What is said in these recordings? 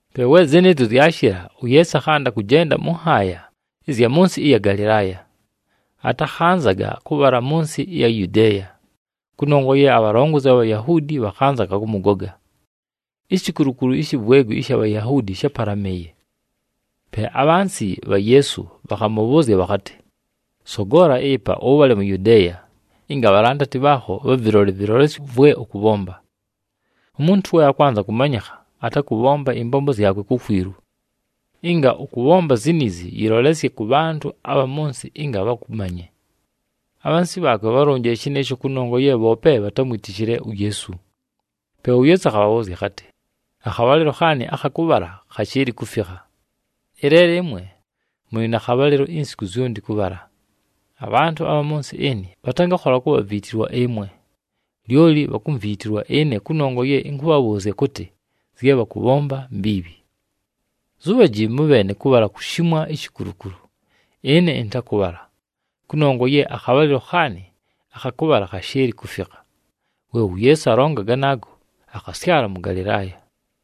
Pe we zɨnɨɨzyo zyashɨla, uYeesu akhanda kʉjenda mʉ nhaaya ɨzya mʉ nsɨ ɨya Galɨlaaya. Atakhanzaga kʉbhala mʉ nsɨ ɨya Yudeeya kʉnongwa ye abhalongozi abha Bhayahuudi bhakhanzaga kʉmʉgoga. Ishikulukulu ishi vwegwi ɨsha Bhayahuudi shápalamɨɨye. Pe abhansi bha Yeesu bhakhamʉbhʉʉzya bhakhatɨ, “Sogola ɨpa, ʉbhale mu Yudeeya, ɨnga abhalandati bhaakho bhavɨlole ɨvɨlolesyo vwe ʉkʉbhomba. Umuntu we akwanza kʉmanyɨkha, atakʉbhomba ɨmbombo zyakwe kukwilu. Ɨnga ʉkʉbhomba ziniizi, yɨlolesye kʉ bhantʉ abha mʉ nsɨ ɨnga bhakʉmanye.” Abhansi bhaakwe bhálonjile shɨnɨɨsho kʉnongwa ye bhoope bhatámwitishile uYeesu. Pe uYeesu akhabhabhʉʉzya akhatɨ, “Akhabhalɨlo khaanɨ akha kʉbhala khashɨɨlɨ kufikha, ɨleelo ɨmwe mʉlɨ na khabhalɨlo insiku zyonti kʉbhala. Abhantʉ abha mʉ nsɨ ɨnɨ bhatangakhola kubhaviitilwa ɨmwe, lyoli bhakumviitilwa ɨne kʉnongwa ye ɨnkʉbhabhʉʉzya kʉtɨ, zye bhakʉbhomba mbiibhi. Zubhaji mʉbheene kʉbhala kushimwa ishikulukulu. Ɨne ɨntakʉbhala, kʉnongwa ye akhabhalɨlo khaanɨ akha kʉbhala khashɨɨlɨ kufikha.” We uYeesu alonga ganaago, akhasyala mʉ Galɨlaaya.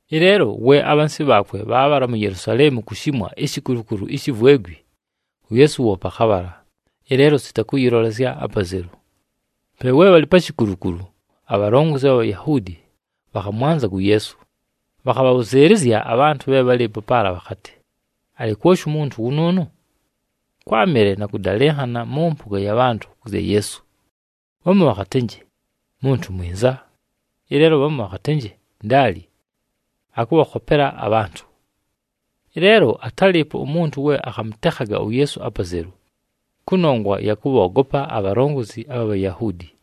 Ɨleelo we abhansi bhaakwe bhaabhala mu Yelusaleemu kushimwa ishikulukulu ishi vwegwi, uYeesu woope akhabhala, ɨleelo sita kʉyɨlolesya apazelu. Pe we bhalɨ pa shikulukulu, abhalongozi abha Bhayahuudi bhakhamwanzaga uYeesu. Bhakhabhabhʉzɨɨlɨzya abhantʉ bhe bhálɨɨpo paala bhakhatɨ, “Alɨ kwoshi umuntu wʉnʉʉnʉ?” Kwámɨle na kʉdalɨnhana mʉ mpʉga ya bhantʉ kʉ zya Yeesu. Bhamu bhakhatɨnjɨ, “Muntu mwinza.” Ɨleelo bhamu bhakhatɨnjɨ, “Ndaali, akʉbhakhopela abhantʉ.” Ɨleelo atálɨɨpo umuntu we akhamʉtekhaga uYeesu apazelu, kʉnongwa ya kʉbhoogopa abhalongozi abha Bhayahuudi.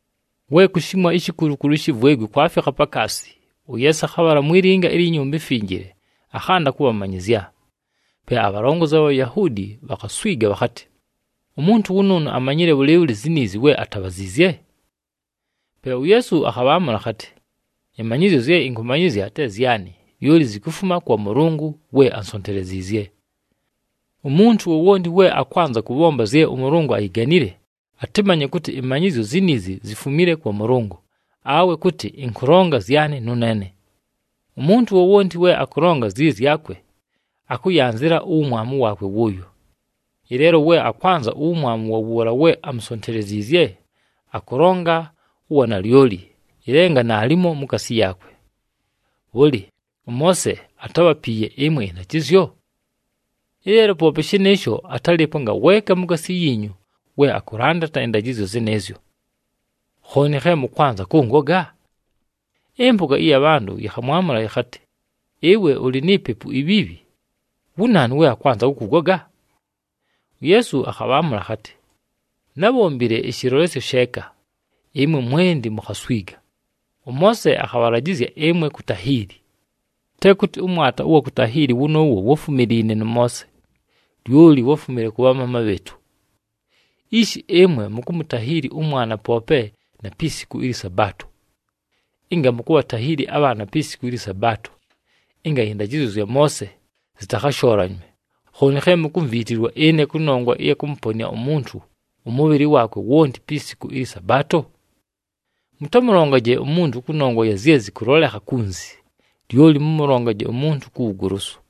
We kushimwa ishikulukulu ishi vwegwi kwafikha pakaasi, uYeesu akhabhala mwi linga ilyi Nyumba iMfinjile, akhanda kʉbhamanyɨzya. Pe abhalongozi abha Bhayahuudi bhakhaswiga bhakhatɨ, “Umuntu wʉnʉʉnʉ amanyile bhʉlɨɨbhʉlɨ ziniizi, we atabhaziizye?” Pe uYeesu akhabhaamʉla akhatɨ, “Ɨmanyɨzyo zye ɨnkʉmanyɨzya te zyanɨ, lyoli zikufuma kwa Mʉlʉngʉ we ánsonteleziizye. Umuntu wowonti we akwanza kʉbhomba zye ʉMʉlʉngʉ ayiganile, atɨmanye kʉtɨ ɨmanyɨzyo ziniizi zifumile kwa Mʉlʉngʉ awe kʉtɨ ɨnkʉlonga zyanɨ nʉneene. Umuntu wowonti we akʉlonga zyɨ zyakwe, akʉyanzɨla uwumwamu waakwe wʉʉyo. Ɨleelo we akwanza uwumwamu wa wʉʉla we amusonteleziizye, akʉlonga uwanalyoli, ɨlenga naalimo mukaasi yaakwe. Bhʉlɨ, ʉMoose atábhapiiye ɨmwe ɨndajɨzyo? Ɨleelo poope shɨnɨɨsho atalɨɨpo ngaweeka mukaasi yiinyu we akʉlandata ɨndajɨzyo zɨnɨɨzyo. Khooni khe mʉkwanza kʉngoga?” Ɨmpʉga ɨya bhantʉ yɨkhamwamʉla yɨkhatɨ, “Ɨwe ʉlɨ ni pepu ibhiibhi! Wu naanu we akwanza kʉkʉgoga?” UYeesu akhabhaamʉla akhatɨ, “Nábhombile ɨshɨlolesyo sheeka, ɨmwe mwenti mukhaswiga. ɄMoose akhabhalajɨzya ɨmwe kutahiili. Te kʉtɨ ʉmwata ʉwa kutahiili wʉnʉʉwo wáfumiliine nʉ Moose, lyoli wáfumile kʉ bhamaama bhɨɨtʉ. Ishi ɨmwe mukumutahiili ʉmwana poope na pi siku ɨlyɨ Sabaato. Ɨnga mukubhatahiili abhaana pi siku ɨlyɨ Sabaato, ɨnga ɨndajɨzyo zya Moose zɨtakhashoolanywe, khooni khe mukumviitilwa ɨne kʉnongwa ɨya kʉmʉponɨa umuntu ʉmʉbhɨlɨ waakwe wonti pi siku ɨlyɨ Sabaato? Mʉtamʉlongaje umuntu kʉnongwa ya zye zɨkʉlolekha kunzi, lyoli mʉmʉlongaje umuntu ku wugolosu.”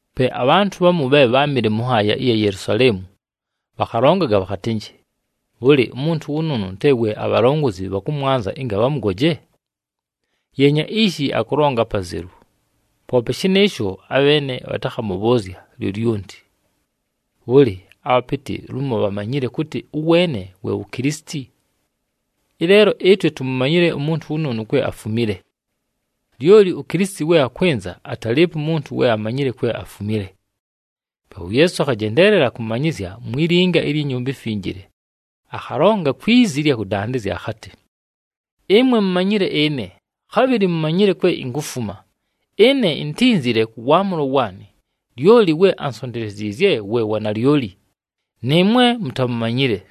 Pe abhantʉ bhamu bhe bháamɨle mʉ nhaaya ɨya Yelusaleemu bhakhalongaga bhakhatɨnjɨ, “Bhʉlɨ, umuntu wʉnʉʉnʉ te we abhalongozi bhakʉmwanza ɨnga bhamʉgoje? Yeenya ishi, akʉlonga apazelu, poope shɨnɨɨsho, abheene bhatakʉmʉbhʉʉzya lyolyonti! Bhʉlɨ, abhapɨtɨ lumo bhamanyile kʉtɨ ʉweene we wu Kilisiti? Ɨleelo ɨtwe tumumanyile umuntu wʉnʉʉnʉ kwe afumile. Lyoli uKilisiti we akwɨnza, atalɨɨpo umuntu we amanyile kwe afumile.” Pe uYeesu akhajendeelela kʉmanyɨzya mwi linga ilyi Nyumba iMfinjile, akhalonga kwi zi ɨlya kʉdandɨzya akhatɨ, “Ɨmwe mumanyile ɨne, khabhɨlɨ mumanyile kwe inkufuma. Ɨne intínzile kʉ waamʉlo waanɨ, lyoli we ansonteleziizye we wa nalyoli, nɨɨmwe mutamumanyile.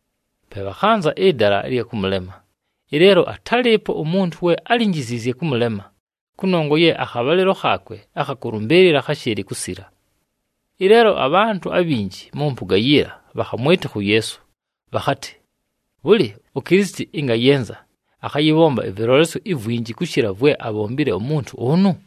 Pe bhakhanza ɨdala ɨlya kʉmʉlema, ɨleelo atálɨɨpo umuntu we álinjiziizye kʉmʉlema, kʉnongwa ye akhabhalɨlo khaakwe akha kʉlʉmbɨɨlɨla kháshɨɨlɨ kusila. Ɨleelo abhantʉ abhinji mʉ mpʉga yiila bhakhamwɨtɨkha uYeesu, bhakhatɨ, “Bhʉlɨ, uKilisiti ɨnga ayɨnza, akhayɨbhomba ɨvɨlolesyo ivwinji kʉshɨla vwe abhombile umuntu ʉnʉ?”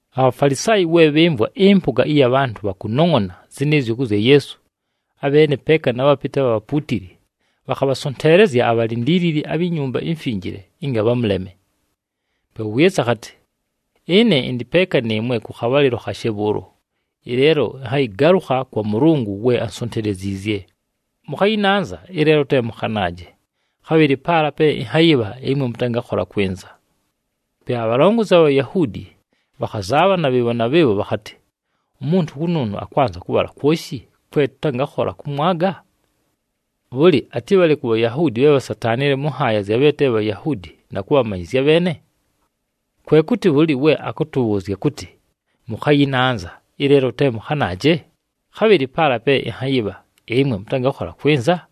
ABhafalisaayi we bhɨmvwa ɨmpʉga ɨya bhantʉ bhakunongʼona zɨnɨɨzyo kʉ zya Yeesu, abheene peeka na bhapɨtɨ abha bhapuutili bhakhabhasonteelezya abhalindiilili abhi Nyumba iMfinjile ɨnga bhamʉleme. Pe uYeesu akhatɨ, “Ɨne ɨndɨ peeka nɨɨmwe kʉ khabhalɨlo khashe bhʉʉlo, ɨleelo ɨnhayɨgalʉkha kwa Mʉlʉngʉ we ansonteleziizye. Mʉkhayɨnanza, ɨleelo te mʉkhanaaje, khabhɨlɨ paala pe ɨnhayɨbha ɨmwe mʉtangakhola kwɨnza.” Pe abhalongozi abha Bhayahuudi bhakhazaabhana bhɨɨbho na bhɨɨbho bhakhatɨ, “Umuntu wʉnʉʉnʉ akwanza kʉbhala kwoshi kwe tʉtangakhola kʉmwaga? Bhʉlɨ, atɨbhale ku Bhayahuudi bhe bhasataanile mʉ nhaaya zya bhe te Bhayahuudi na kʉbhamanyɨzya abheene? Kwe kʉtɨ bhʉlɨ we akʉtʉbhʉʉzya kʉtɨ, ‘Mʉkhayɨnanza, ɨleelo te mʉkhanaaje, khabhɨlɨ paala pe ɨnhayɨbha, ɨmwe mʉtangakhola kwɨnza’?”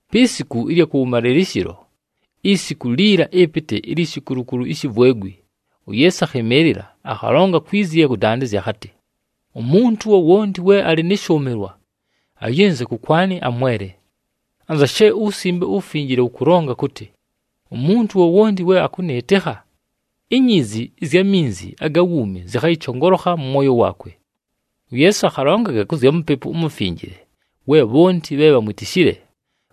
Pi siku ɨlya kʉwʉmalɨlɨshɨlo, isiku liila ɨpɨtɨ ilyi shikulukulu ishi vwegwi, uYeesu akhɨmɨɨlɨla akhalonga kwi zi ɨlya kʉdandɨzya akhatɨ, “Umuntu wowonti we alɨ nɨ shʉʉmɨlwa, ayɨnze kʉkwanɨ amwele. Anza she uWusimbe uWufinjile wʉkʉlonga kʉtɨ, umuntu wowonti we akʉnɨɨtɨkha, ‘Inyiizi ɨzya minzi aga wuumi zɨkhayɨchongolokha mʉ mwoyo waakwe.’” UYeesu akhalongaga kʉ zya Mupepu uMufinjile we bhonti bhe bhamwitishile,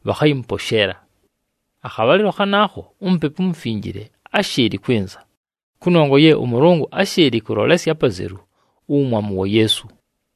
bhakhayɨmʉposheela. Akhabhalɨlo khanaakho, uMupepu uMufinjile áshɨɨlɨ kwɨnza, kʉnongwa ye ʉMʉlʉngʉ áshɨɨlɨ kʉlolesya apazelu uwumwamu wa Yeesu.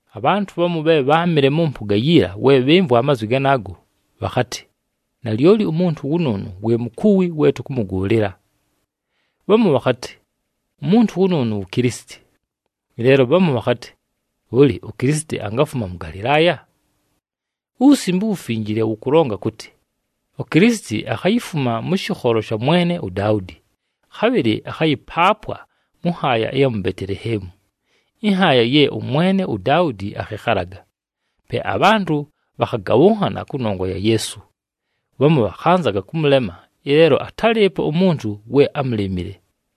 Abhantʉ bhamu bhe bháamɨle mʉ mpʉga yiila we bhɨmvwa amazwi ganaago, bhakhatɨ, “Nalyoli umuntu wʉnʉʉnʉ we mukuwi we tʉkʉmʉgʉʉlɨla.” Bhamu bhakhatɨ, “Umuntu wʉnʉʉnʉ wu Kilisiti.” Ɨleelo bhamu bhakhatɨ, “Bhʉlɨ, uKilisiti angafuma mʉ Galɨlaaya? UWusimbe uWufinjile wʉkʉlonga kʉtɨ, uKilisiti akhayifuma mʉ shɨkholo sha mwene uDaudi, khabhɨlɨ akhayɨpaapwa mʉ nhaaya ɨya mu Beteleheemu, ɨnhaaya ye ʉmwene uDaudi akhɨkhalaga.” Pe abhantʉ bhakhagabhʉnhana kʉnongwa ya Yeesu. Bhamu bhakhanzaga kʉmʉlema, ɨleelo atálɨɨpo umuntu we ámulemile.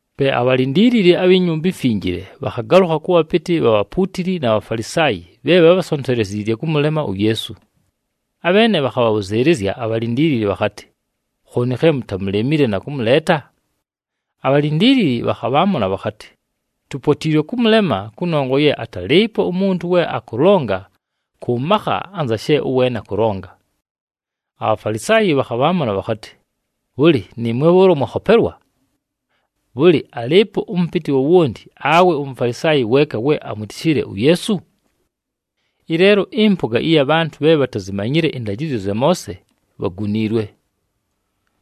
Pe abhalindiilili abhi Nyumba iMfinjile bhakhagalʉkha kʉ bhapɨtɨ bha bhapuutili na Bhafalisaayi bhe bhabhasonteleziizye kʉmʉlema uYeesu. Abheene bhakhabhabhʉzɨɨlɨzya abhalindiilili bhakhatɨ, “Khooni khe mutamulemile na kʉmʉleeta?” Abhalindiilili bhakhabhaamʉla bhakhatɨ, “Tupotiilwe kʉmʉlema kʉnongwa ye atalɨɨpo umuntu we akʉlonga kʉ makha anza she ʉweene akʉlonga.” ABhafalisaayi bhakhabhaamʉla bhakhatɨ, “Bhʉlɨ, nɨɨmwe bhʉʉlo mwakhopelwa? Bhʉlɨ, alɨɨpo ʉmʉpɨtɨ wowonti awe uMufalisaayi weeka we amwitishile uYeesu? Ɨleelo ɨmpʉga ɨya bhantʉ bhe bhatazimanyile ɨndajɨzyo zya Moose bhaguniilwe.”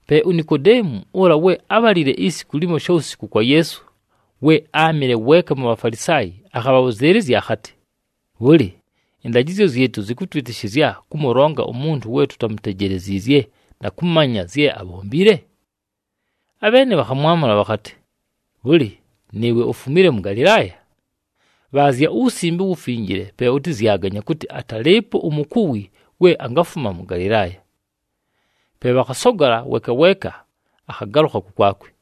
Pe uNikodeemu, ʉla we ábhalile isiku limo shawusiku kwa Yeesu, we áamɨle weeka mu Bhafalisaayi, akhabhabhʉzɨɨlɨzya akhatɨ, “Bhʉlɨ, ɨndajɨzyo zyɨtʉ zɨkʉtwɨtɨshɨzya kʉmʉlonga umuntu we tutamutejeleziizye na kʉmanya zye abhombile?” Abheene bhakhamwamʉla bhakhatɨ, “Bhʉlɨ, nɨɨwe ufumile mʉ Galɨlaaya? Bhaazya uWusimbe uWufinjile, pe ʉtɨzyaganye kʉtɨ atalɨɨpo umukuwi we angafuma mʉ Galɨlaaya.” [ Pe bhakhasogola, weeka weeka akhagalʉkha kʉkwakwe.